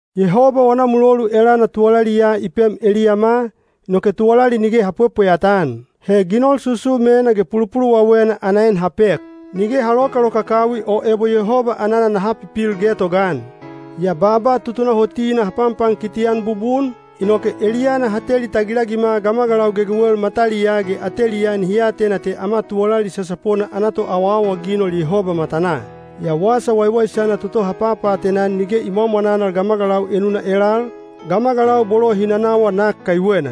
Yehoba wana mulolu elana tuwalali ya i pem eliyama, inoke tuwalali nige ha pwepweyata-an. He ginol susumena ge pulupuluwawena ana en ha pek. Nige ha lokalokakawi o ebo Yehoba anana naha pipil getogaan. Yaa baaba tutunahotina ha panpankiti-an bubun, inoke eliyana ha teli tagilagima gamagalau gegewel mataliyaa ge ateliyaa nihi atena te ama tuwalali sasapona ana toawaawaginol Yehoba matanaa. Yaa Wasa Waiwaisana toto ha papaatena-an nige i mwamwananal gamagalau enuna elal, gamagalau bolo hi nanawa nak kaiwena.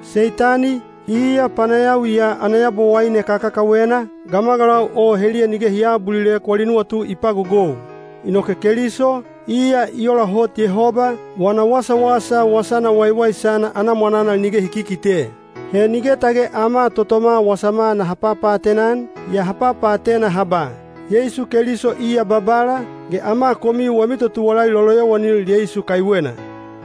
Seitani, iya panayawi ya ana yabowaine kakakawena, gamagalau o heliya nige hi aabulilek wali nuwatu i pagogou. Inoke Keliso, iya i ola hot Yehoba, wana wasawasa Wasana Waiwaisana ana mwananal nige hi kikite. He nige tage ama totoma wasama naha papaatena-an, yaa ha papaatena ha ba, “Yeisu Keliso iya Babala, ge ama komiu wami totuwalali loloyowanil Yeisu kaiwena.”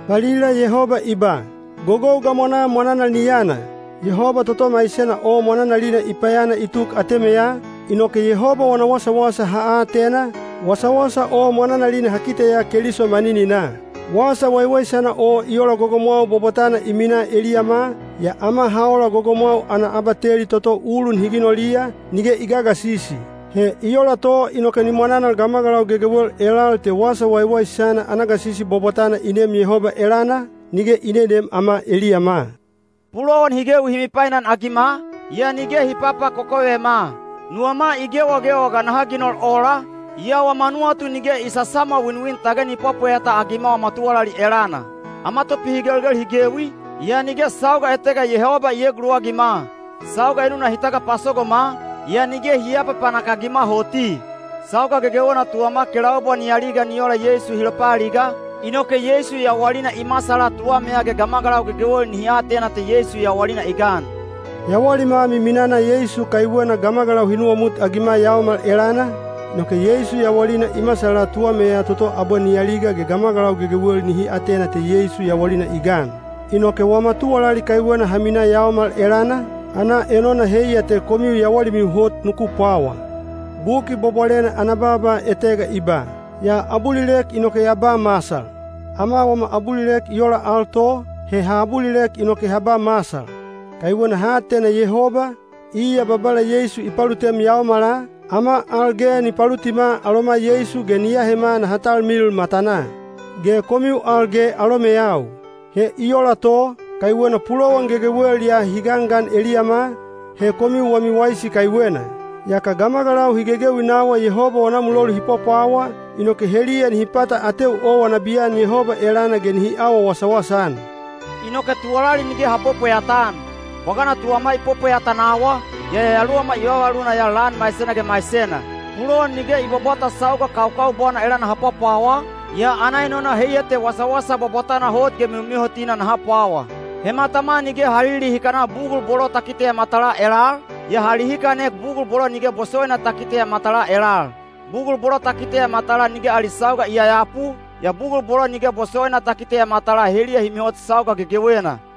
Valila Yehoba i ba, “Gogou gamwanaa mwananal ni yana.” Yehoba toto maisena o mwananalina i payana i tuk atemeya, inoke Yehoba wana wasawasa ha atena, wasawasa o mwananalina ha kiteya Keliso manininaa. Wasa Waiwaisana o i ola gogomwau bwabwatana i minaa eliyama, yaa ama ha ola gogomwau ana abateli toto ulun hi ginoliya, nige i gagasisi. He i ola to inoke ni mwananal gamagalau gegewel elal te Wasa Waiwaisana ana gasisi bwabwatana i neem Yehoba elana, nige i neneem ama eliyama. Pulowan hi gewi hi mipainagima, yaa nige hi papakokovema; nuwama i gewagewa ga naha ginol ola, yaa wama nuwatu nige i sasamwawinwin tage ni pwapweyata-agima wama tuwalali elana; ama topihigelgel hi gewi, yaa nige sauga etega Yehoba i eeguluwagima; sauga enuna hi tagapasogoma, yaa nige hi aapapanak-agima hoti. Sauga gegewena tuwama kelaubwa ni aliga ni ola Yeisu hi lopaaliga, inoke Yeisu yawalina i masala tuwameya ge gamagalau gegewel nihi atena te Yeisu yawalina i gan. Yawalima miminana Yeisu kaiwena gamagalau hi nuwamutagima yaomal elana, inoke Yeisu yawalina i masala tuwameya toto abwe ni aliga ge gamagalau gegewel nihi atena te Yeisu yawalina i gan. Inoke wama tuwalali kaiwena ha minaa yaomal elana, ana enona heiya te komiu yawalimiu hot nuku pwawa. Buki Bwabwalena ana baaba etega i ba, “Ya abulilek inoke ya ba masal.” Ama wama abulilek i ola al to, he ha abulilek inoke ha ba masal. Kaiwena ha atena Yehoba, iya Babala Yeisu i palutem yaomala, ama al ge ni palutima aloma Yeisu ge ni ahema naha talmilil matanaa. Ge komiu al ge alomeyau. He i ola to, kaiwena pulowan gegewel ya hi gangan eliyama, he komiu wami waisi kaiwena. Yaka gamagalau hi gegewi nawa Yehoba wana mulolu hi pwapwawa, inoke heliya nihi pata ateu owa nabiyan Yehoba elana ge nihi awa wasawasa-an. Inoke tuwalali nige ha pwepweyata-an. Bwagana tuwama i pwepweyata nawa, yaa yayaluwama i vavavaluna ya lan maisena ge maisena. Pulowan nige i bwabwata sauga kaukaubwana elana ha pwapwawa, yaa ana enona heiya te wasawasa bwabwatana hot ge mihomihotina naha pwawa. He matama nige ha lilihikana bugul bolo ta kiteya matalaa elal, yaa ha lihikanek bugul bolo nige bosowaina ta kiteya matalaa elal. Bugul bolo ta kiteya matalaa nige ali sauga i yayapu, yaa bugul bolo nige bosowaina ta kiteya matalaa heliya hi mihot sauga gegewena.